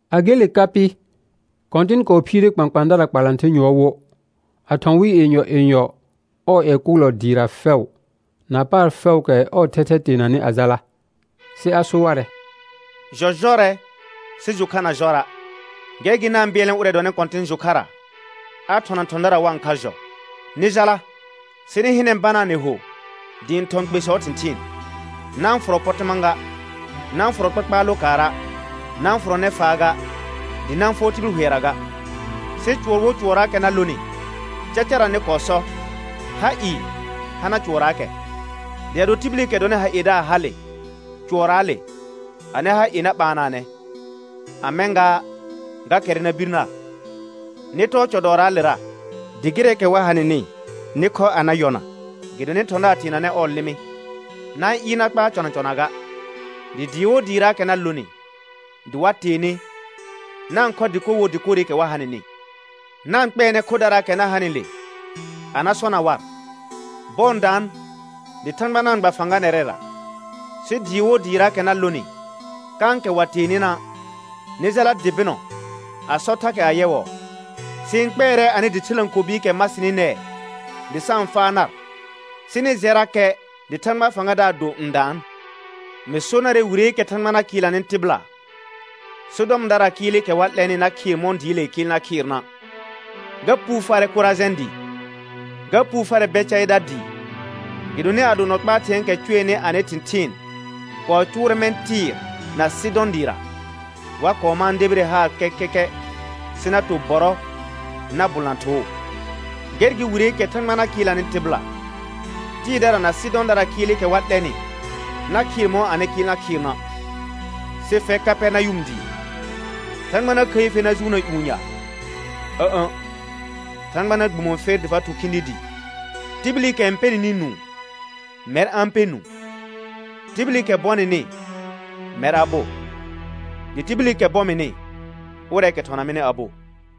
A gele ka pɩ, Kɔ̃tɩn kɔɔ phiire kpãkpãadara kpalãther yʋɔr wo, a thɔ̃ wɩ yenyɔ yenyɔ ɔɔ ƴɛ kʋʋlɔ dɩɩra fɛʋ, na paar fɛʋʋkɛ ɔɔ thɛthɛ teenanɩ a jala. Sɩ a so warɛ: Jɔ jɔrɛ, sɩ jʋ kha na jɔra'. Gɛr gɩ na-n bɩɛlnɛ ʋrɛ dɔnɩ Kɔ̃tɩn jʋ kharra, a thɔna thɔ̃dara wa-n kha jɔ. Nɩ jala, sɩ nɩ hɩnɛ, banaa nɩ ho dɩ ɩ̃ thɔ̃ kpesɔɔ thɩ̃thɩɩn. Na-n fʋrɔ pɔtɩma ga, na-n fʋrɔ kpakpaar lokaara', na-n fʋrɔ nɛfaa ga, dɩ na-n fʋɔr tibil hʋɛra ga. Sɩ cʋɔr wo cʋɔrraakɛ na lonɩ, cacara nɩ kɔɔ sɔ: Ha ɩɩ hana cʋɔrraakɛ. Dɩ ado tibilikɛ dɔnɩ ha iedaar hale cʋɔrraale, anɩ ha ie na ɓaanaanɛ, a mɛ̃ gaa ga kɛrrɛ na bir nar. Nɩ tɔɔ cɔ dɔɔraalera, dɩ gɩrɛɛkɛ wa ha nɩnɩ nɩ khɔ a na yɔna, gɩdonɩ thɔ̃daar teenanɛ ɔɔ lɩmɩ. Na-n ɩɩr na kpaar cɔna cɔna ga. Dɩ dɩɩ wo dɩɩraakɛ na lonɩ dɩ wa tee nɩ, na-n khɔ dɩkor wo dɩkorɩkɛ wa ha nɩnɩ. Na-n kpɛɛnɛ khodaraakɛ na hanɩle a na sɔna war: Bɔɔ n daan dɩ Thãgba na-n gba fãga nɛrɛra. Sɩ dɩɩ wo dɩɩraakɛ na lonɩ kãkɛ wa tee nɩna', nɩ jala dɩ bɩnɔ a sɔ thakɛ ayɛwɔɔ: Sɩ-n kpɛɛrɛ anɩ dɩ thɩlãkobiikɛ ma sɩnɩ nɛɛ dɩ sa-n faa nar, sɩ nɩ jɛrakɛ dɩ Thãgbaa fãgadaar do n daan. Mɩ so narɛ wireekɛ Thãgba na kɩɩlnanɩ tɩbɩla Sɔdɔmdaraa kɩɩlɩkɛ wa 'lɛnɩ na khɩɩr mɔ̃ dɩɩlee kɩɩl na khɩɩrna'. Ga puu farɛ Korajɛ̃ dɩɩ. Ga puu farɛ Bɛcaɩda dɩɩ. Gɩdonɩ ado nɔ kpaa thɩ̃ɛɛkɛ cʋɛnɩ anɩ thɩ̃thɩɩn kɔɔ cʋʋrɛ mɛ̃ Tɩɩr na Sɩdɔ̃ dɩɩra, wa kɔɔ mãa debire haar kɛkɛkɛ sɩ na to bɔrɔ na bʋlna thoo. Gɛr gɩ wireekɛ Thãgba na kɩɩlnanɩ tɩbɩla, Tɩɩrdara na Sɩdɔ̃daraa kɩɩlɩkɛ wa 'lɛnɩ na khɩɩr mɔ̃ anɩ kɩɩl na khɩɩrna'. Sɩ fɛr Kapɛrnayʋm dɩɩ, Thãgba na khəi fer na jʋʋnna ƴũ ya? Ǝ̃'ə̃, Thãgba na gbumo fer dɩ fa thʋ khĩdi dɩɩ. Tibilikɛ n pɛ nɩnɩ nũu, mɛr a-n pɛ nũu. Tibilikɛ bɔ nɩnɩ, mɛr a bo; dɩ tibilikɛ bɔ mɩnɩ, ʋrɛɛkɛ thɔna mɩnɩ a bo.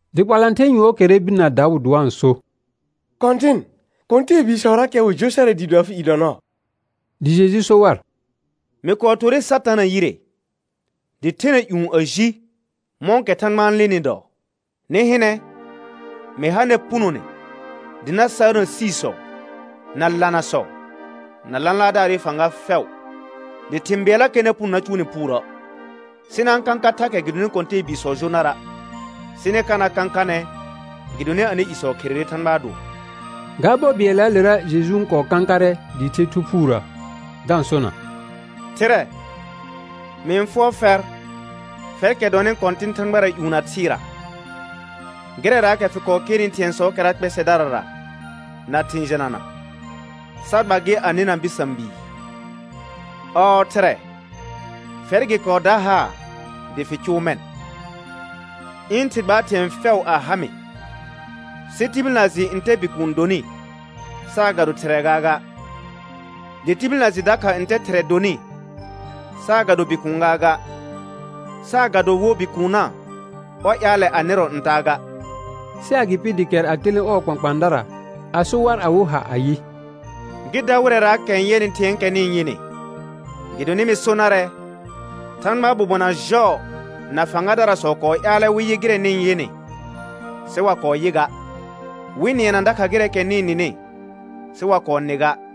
Dɩ kpalãther yʋɔr kɛrrɛ bir na daʋ dɩ wa-n so: Kɔ̃tɩn, kɔ̃tɛɛbiisɔrakɛ wɩ jo sarɛ dɩɩ do afɩ i dɔ nɔɔ. Dɩ Jeju so war: Mɩ kɔɔ torre Satana yire dɩ thena ƴũ a ji, mɔ̃kɛ thãgba n lenɩ dɔɔ. Nɩ hɩnɛ, mɩ ha nɛr punone dɩ na saarna siisɔ na lanasɔ na lãlaardaarɩ fãga fɛʋ, dɩ thɩ̃ bɩɛllakɛ na puno na cʋʋ nɩ puurə'. Sɩ na-n kãka thakɛ gɩdonɩ kɔ̃tɛɛbiisɔ jo nara', sɩ nɩ ka na kãkanɛ gɩdonɩ anɩ isɔ kherere Thãgbaa dʋɔ. Ga bɔ bɩɛllaalera Jeju n kɔɔ kãkarɛ dɩɩ the Thu Phuurə da-n sona: Thɩrɛ, mɩ-n fʋɔr fɛr, fɛrkɛ dɔnɩ Kɔ̃tɩn thãgbara ƴũ na thɩɩra, gɩrɛraakɛ fɩ kɔɔ kernɩ thɩ̃ɛsɔɔkɛra kpɛsɛdarara na thɩ̃ jɩnana, sa gba gɩ a nɩna bɩsã bii. Ɔɔ Thɩrɛ, fɛr gɩ kɔɔ da haar dɩ fɩ cʋʋ mɛ̃. Ɩ̃ Thɩ gbaar thɩ̃ɛ fɛʋ a ha mɩ, sɩ tibil na jɩ ntɛ Bikuun donɩ saagado Thɩrɛ gaaga; dɩ tibil na jɩ dakha ntɛ Thɩrɛ donɩ saagado Bikuun gaaga, saagado wo Bikuunna ɔr ƴaalɛ a nɩrɔ ntaa ga. Sɩ agɩpɩ dɩ kɛr a telẽ ɔɔ kpãkpãadara a so war awɩ ha ayɩ: Gɩ da wɩrɛraakɛ n yɛnɩ thɩ̃ɛɛkɛ nɩ-n yɩnɩ. Gɩdonɩ mɩ so narɛ, Thãgbaa bobona jɔɔ na fãgadarasɔ kɔɔ ƴaalɛ wɩ yɩ gɩrɛ nɩ-n yɩnɩ sɩ wa kɔɔ yɩ ga, wɩ nɩɛna dakha gɩrɛɛkɛ nɩ-n nɩnɩ sɩ wa kɔɔ nɩ ga.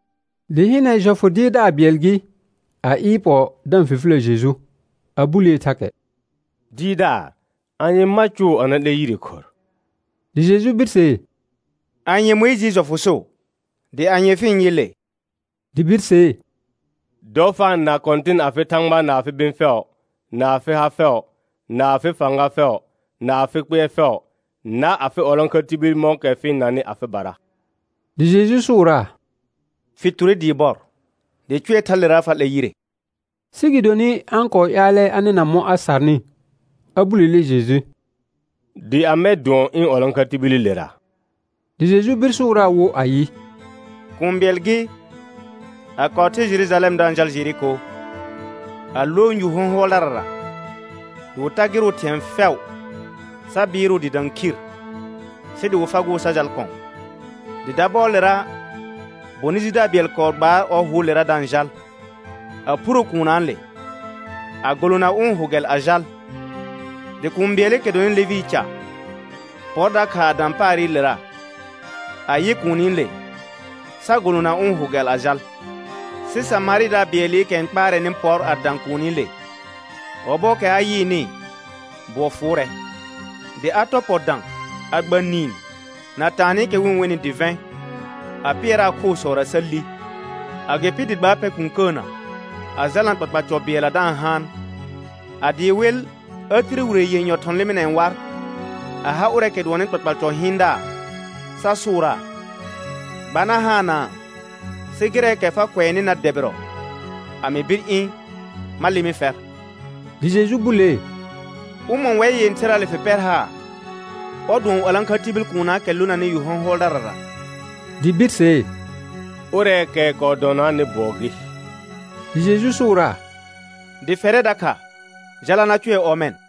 Dɩ hɩnɛ, jɔfʋ dɩɩrdaar bɩɛl gɩ, a ɩɩr pɔ da-n fifilə Jeju, a bulee thakɛ: Dɩɩrdaar, anye ma cʋʋ a na 'lɛ yire khorr? Dɩ Jeju birsee: Anye Mʋɩjɩɩ jɔfʋ so? Dɩ anye fɩ-n yɩ le? Dɩ birsee: «Dɔ fa-n na Kɔ̃tɩn afɩ Thãgba na afɩ bɩ̃ fɛʋ, na afɩ ha fɛʋ, na afɩ fãga fɛʋ, na afɩ kpɩɛr fɛʋ, na afɩ 'walãkha tibil mɔ̃kɛ fɩ-n nanɩ afɩbara.» Dɩ Jeju sʋʋraa: Fɩ ture dɩɩ bɔr, dɩ cʋɛ thalera fa 'lɛr yire. Sɩ gɩdonɩ a-n kɔɔ ƴaalɛ a nɩna mɔ̃ a sarnɩ, a bulele Jeju: Dɩ amɛ dʋɔn ɩ̃ 'walãkha tibililera? Dɩ Jeju bir sʋʋraa wo ayɩ: Kũu bɩɛl gɩ, a kɔɔ the Jerujalɛm da-n jal Jeriko, a lõ yu hɔ̃hʋɔldarara dɩ wɩ tagɩrʋʋ thɩ̃ɛ fɛʋ, sa bɩɩrʋʋ dɩ dã khir, sɩ dɩ wɩ fagʋʋ sa jal kɔ̃. Dɩ dabɔɔlera, bonɩ jidaar bɩɛl kɔɔ gbaar ɔ hʋʋlera da-n jal, a phuro kuunnaale a golona ʋ̃ hʋ gɛl a jal. Dɩ kũu bɩɛlɩkɛ dɔnɩ Levɩɩ ca pɔr dakha a dã paarɩlera, a yɩ kuunile sa golona ʋ̃ hʋ gɛl a jal. Sɩ Samarɩdaar bɩɛlɩkɛ n kpaarɛnɩ pɔr a dã kuunile. Ɔbɔɔkɛ a yɩɩnɩ, bʋɔ fʋʋrɛ. Dɩ a tɔr pɔ dã a gba niin na taanɩkɛ wɩ-n wenɩ dɩvɛ̃, a pɩɛraa khoosɔra sa li. Agɩpɩ dɩ gbaa pɛ kũkəənə, a jalna kpakpal cɔ bɩɛlla da-n haan. A dɩɩ wɩl, a tire wire yenyɔ thɔ̃ lɩmɩnɛɛ war a ha ʋrɛɛkɛ dʋɔnnɩ kpakpal cɔ hɩɩndaar sa sʋʋraa: Gba na haanaa, sɩ gɩrɛɛkɛ fa kʋɛnɩ na dɛbɩrɔ, a mɩ bir ɩ̃ ma lɩmɩ fɛr. Dɩ Jeju bulee: Ʋmɔ̃ wɛr yẽtherraale fɩ pɛr haar, ɔr dʋɔn 'walãkha tibil kuunnaakɛ lonanɩ yu hɔ̃hʋɔldarara? Dɩ birsee: Ʋrɛɛkɛ kɔɔ dɔnaanɩ bʋɔ gɩ. Dɩ Jeju sʋʋraa: Dɩ fɛrɛ dakha jala na cʋɛ ɔmɛ̃.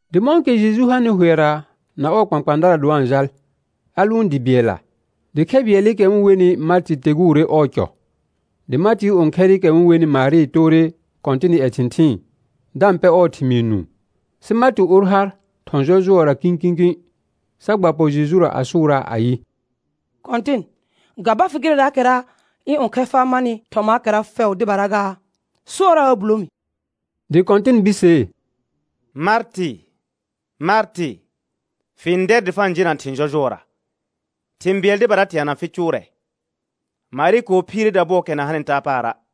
Dɩ mɔ̃kɛ Jeju hanɩ hʋɛra na ɔɔ kpãkpãadara dɩ wa-n jal, a lʋʋn dɩ bɩɛlla. Dɩ khɛ bɩɛlɩkɛ wɩ-n wenɩ Martɩ teguure ɔɔ cɔ. Dɩ Martɩɩ õkhɛrɩkɛ wɩ-n wenɩ Marɩ toore Kɔ̃tɩnɩ ƴɛ thɩ̃thɩɩn, da-n pɛ ɔɔ thɩmɩɩ nũu. Sɩ Martɩ or har thɔ̃ jɔjʋɔra kĩkĩkĩ, sa gba pɔ Jejura a sʋʋraa ayɩ: Kɔ̃tɩn, ga ba fɩ gɩrɛɛkɛra ɩ̃ õkhɛr faa marnɩ thɔmaakɛra fɛʋ dɩbara gaa? Sʋɔraa a bulo mi. Dɩ Kɔ̃tɩn birsee: Martɩ, Martɩ, fɩ-n dɛr dɩ fa-n jena thɩ̃ jɔjʋɔra. Thɩ̃ bɩɛl dɩbara teana fɩ cʋʋrɛ. Marɩ kɔɔ phiire dabʋɔɔkɛ na hanɩ taa paara'.